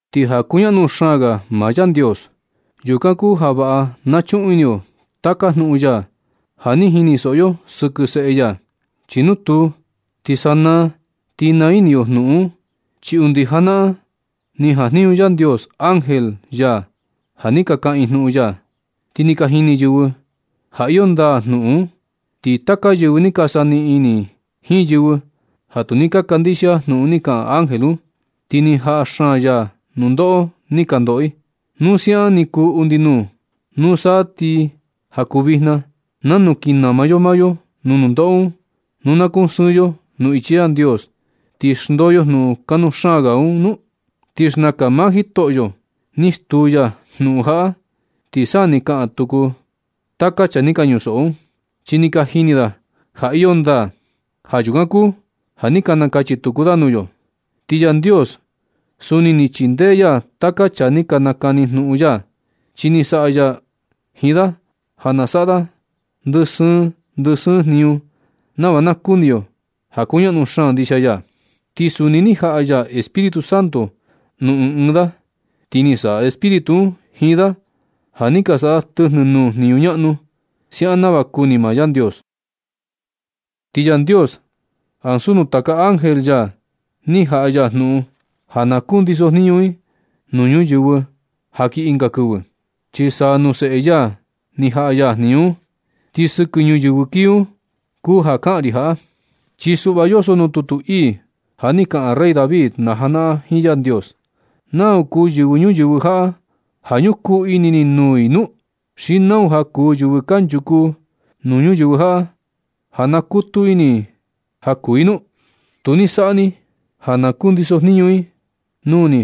Ti ja kuñaꞌnu xaan ga maa Yandios, yukan kuu ja vaꞌa na chuꞌun ini yo taka jnuꞌun ya ja ni jinisoꞌo yo sɨkɨ Seꞌe ya. Chi nu tuu, ti sanaa ti naa ini yo jnuꞌun un. Chi undi janaꞌan ni jajniñu Yandios ángel ya ja ni ka kaꞌan i jnuꞌun ya, ti ni ka jini yɨvɨ ja iyo ndaa jnuꞌun un. Ti taka yɨvɨ ni ka saniꞌin ini jiin yɨvɨ ja tu ni ka kandixia jnuꞌun ni kaꞌan ángel un, ti ni jaꞌa xaan ya nundoꞌo ni ka ndoꞌo i. Nu siaꞌan ni kuu undi nuu, nusa ti ja kuu vijna, ¿nanu kin nama yo maa yo nuu nundoꞌo un nu na kusɨɨn yo nuu ichi Yandios, ti xndoo yo jnuꞌun kanuu xaan ga un nu? Ti xnakan maa Jitoꞌo ni stuu ya jnuꞌun jaꞌa, ti sa ni ka kaꞌan tuku taka chaa ni ka ñusoꞌo un, chi ni ka jini da ja iyo ndaa. Ja yukan kuu ja ni ka nakachi tuku da nuu yo. Ti Yandios suni ni chindee ya taka chaa ni ka nakani jnuꞌun ya. Chi ni saꞌa ya jiin da ja na saꞌa da ndɨ sɨɨn ndɨ sɨɨn jniñu nava na nakuni yo ja kuñaꞌnu xaan ndixia ya. Ti suni ni jaꞌa ya Espíritu Santo nuu ɨɨn ɨɨn da. Ti ni saꞌa Espíritu un jiin da ja ni ka saꞌa da tɨjnɨ nuu jniñu ñaꞌnu, siaꞌan nava kuni maa Yandios. Ti Yandios ansu nuu taka ángel ya ni jaꞌa ya jnuꞌun ja na kundisojniñu i nuu ñuyɨvɨ ja kii ɨnga kɨvɨ, chi sa nuu Seꞌe ya ni jaꞌa ya jniñu un. Ti sɨkɨ ñuyɨvɨ kii un kuu ja kaꞌan ri jaꞌa. Chi suꞌva yoso nuu tutu ii ja ni kaꞌan rey David najanaꞌan jiin Yandios: ¿Nau kuu yɨvɨ ñuyɨvɨ jaꞌa ja ñukuu ini ni nuu i nu? ¿Xi nau ja kuu yɨvɨ kanchuku nuu ñuyɨvɨ jaꞌa ja nakutu ini ni ja kuu i nu? Tu ni saꞌa ni i ja na kundisojniñu i nuu ni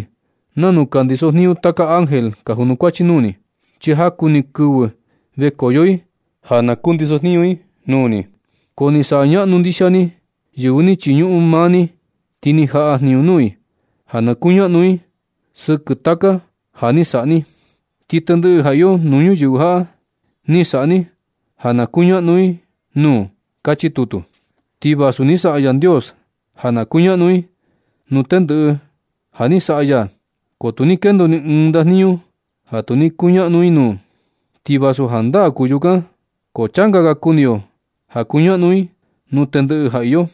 nanu ka kandiso jniñu taka ángel ka junukuachi nuu ni. Chi jaku ni kɨvɨ vekoyo i ja na kundisojniñu i nuu ni. Ko ni saꞌa ñaꞌnu ndixia ni yɨvɨ ni chiñuꞌun maa ni. Ti ni jaꞌa jniñu nuu i ja na kuñaꞌnu i sɨkɨ taka ja ni saꞌa ni. Ti tendɨꞌɨ ja iyo nuu ñuyɨvɨ jaꞌa, ni saꞌa ni ja na kuñaꞌnu i nuu. Kachi tutu. Ti vasu ni saꞌa Yandios ja na kuñaꞌnu i nuu tendɨꞌɨ ja ni saꞌa ya, ko tu ni kendo ni ɨɨn ndajniñu ja tu ni kuñaꞌnu i nuu. Ti vasu jandaa kuu yukan, ko changa ga kuni yo ja kuñaꞌnu i nuu tendɨꞌɨ ja iyo.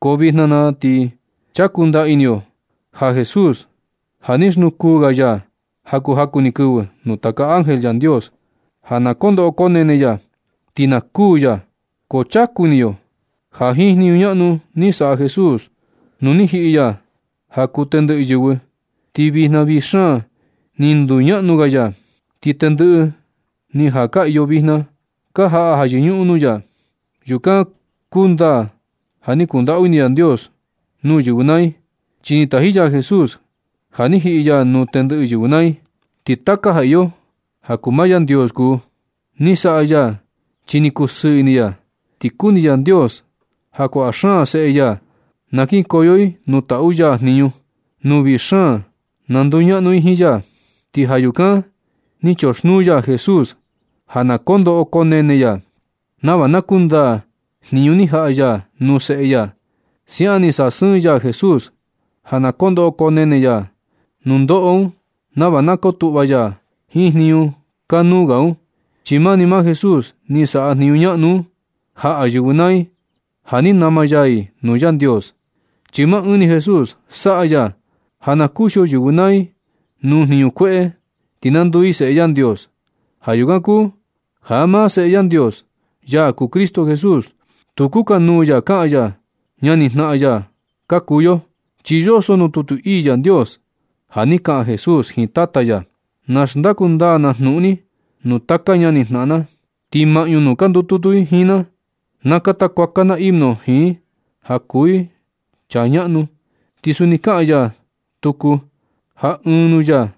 Ko vijna na ti ni chaku ndaa ini yo ja Jesús, ja ni xnukuu ga ya ja kuu jaku ni kɨvɨ nuu taka ángel Yandios ja na ko ndoꞌo konene ya ti na kuū ya. Ko chaku ini yo ja jiin jniñu ñaꞌnu ni saꞌa Jesús, nu ni jiꞌi ya ja kuu tendɨꞌɨ yɨvɨ, ti vijna vii xaan ni nduñaꞌnu ga ya. Ti tendɨꞌɨ ni ja ka iyo vijna ka jaꞌa ja yɨñuꞌun nuu ya. Yukan kundaa ja ni kundaꞌu ini Yandios nuu yɨvɨ naa i, chi ni taji ya Jesús ja ni jiꞌi ya nuu tendɨꞌɨ yɨvɨ naa i. Ti taka ja iyo ja kuu maa Yandios kuu. Ni saꞌa ya chi ni kusɨɨ ini ya. Ti kuni Yandios ja kuaꞌa xaan seꞌe ya na kinkoyo i nuu taꞌu ya jniñu, nuu vii xaan na nduñaꞌnu i jiin ya. Ti ja yukan ni choxnuu ya Jesús ja na koo ndoꞌo koo nene ya nava na kundaa jniñu ni jaꞌa ya nuu Seꞌe ya. Siaꞌan ni sasɨɨn ya Jesús ja na koo ndoꞌo koo nene ya nundoꞌo un nava na kotuꞌva ya jiin jniñu kanuu ga un. Chi mani maa Jesús ni saꞌa jniñu ñaꞌnu un, jaꞌa yɨvɨ naa i ja ni nama ya i nuu Yandios. Chi maa ɨɨn ni Jesús saꞌa ya ja na kuxio yɨvɨ naa i nuu jniñu kueꞌe ti na nduu i seꞌe Yandios. Ja yukan kuu ja maa Seꞌe Yandios, ya kuu Cristo Jesús, tu kukanuu ya kaꞌan ya ñanijnaꞌan ya ka kuu yo, chi yoso nuu tutu ii Yandios ja ni kaꞌan Jesús jiin Tata ya: Na xndaku ndaa na jnuꞌun ni nuu taka ñanijnaꞌan na. Ti maꞌñu nuu ka ndututu i jiin na, na kata kuaka na himno jiin i ja kuu i chaa ñaꞌnu. Ti suni kaꞌan ya tuku ja ɨɨn nuu ya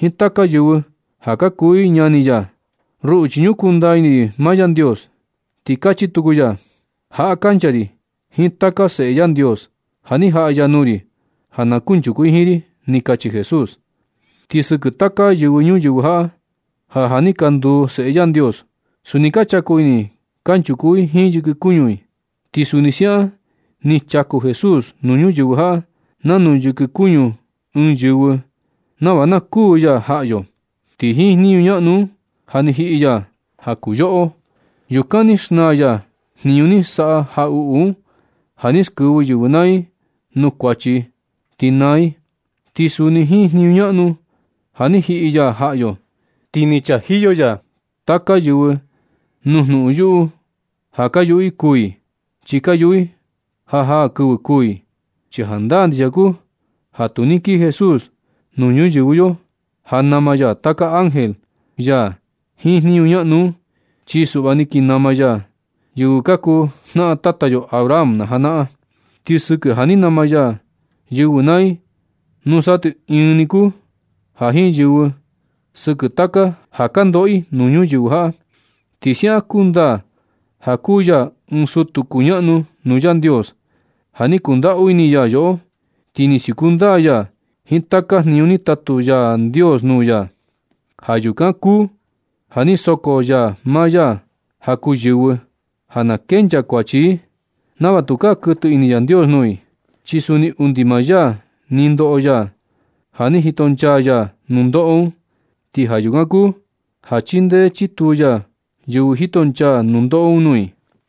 jiin taka yɨvɨ ja ka kuu i ñani ya: Ruꞌu chi ñukuu ndaa ini ri maa Yandios. Ti kachi tuku ya: Jaꞌa kancha ri jiin taka seꞌe Yandios ja ni jaꞌa ya nuu ri ja na kunchuku i jiin ri. Ni kachi Jesús. Ti sɨkɨ taka yɨvɨ ñuyɨvɨ jaꞌa ja ja ni ka nduu seꞌe Yandios, suni ka chaku i kanchuku i jiin yɨkɨ kuñu i, ti suni siaꞌan ni chaku Jesús nuu ñuyɨvɨ jaꞌa nanu yɨkɨ kuñu ɨɨn yɨvɨ nava na kuū ya jaꞌa yo. Ti jiin jniñu ñaꞌnu un, ja ni jiꞌi ya ja kuu yoꞌo. Yukan ni xnaa ya jniñu ni saꞌa jaꞌuꞌu un ja ni skɨvɨ yɨvɨ naa i nuu kuachi i ti naa i. Ti suni jiin jniñu ñaꞌnu ja ni jiꞌi ya jaꞌa yo, ti ni chajiyo ya taka yɨvɨ nuu jnuꞌun yuꞌu ja ka yuꞌu i kuu i, chi ka yuꞌu i ja jaa kɨvɨ kuū i. Chi jandaa ndixia kuu ja tu ni kii Jesús nuu ñuyɨvɨ yo ja nama ya taka ángel ya jiin jniñu ñaꞌnu un. Chi suꞌva ni kii nama ya yɨvɨ ka kuu jnaꞌan tata yo Abraham najanaꞌan. Ti sɨkɨ ja ni nama ya yɨvɨ naa i, nusa ti ɨɨn ni kuu ja jiin yɨvɨ, sɨkɨ taka ja ka ndoꞌo i nuu ñuyɨvɨ jaꞌa. Ti siaꞌan kundaa ja kuu ya ɨɨn sutu kuñaꞌnu nuu Yandios, ja ni kundaꞌu ini ya yoꞌo, ti ni siuku ndaa ya jiin taka jniñu ni tatu Yandios nuu ya. Ja yukan kuu ni soko ya maa ya ja kuu yɨvɨ ja na kenchaa kuachi i, nava tukaa kuɨtɨ ini Yandios nuu i. Chi suni undi maa ya ni ndoꞌo ya ja ni jito nchaa ya nundoꞌo un. Ti ja yukan kuu ja chindee chituu ya yɨvɨ jitonchaa nundoꞌo un nuu i.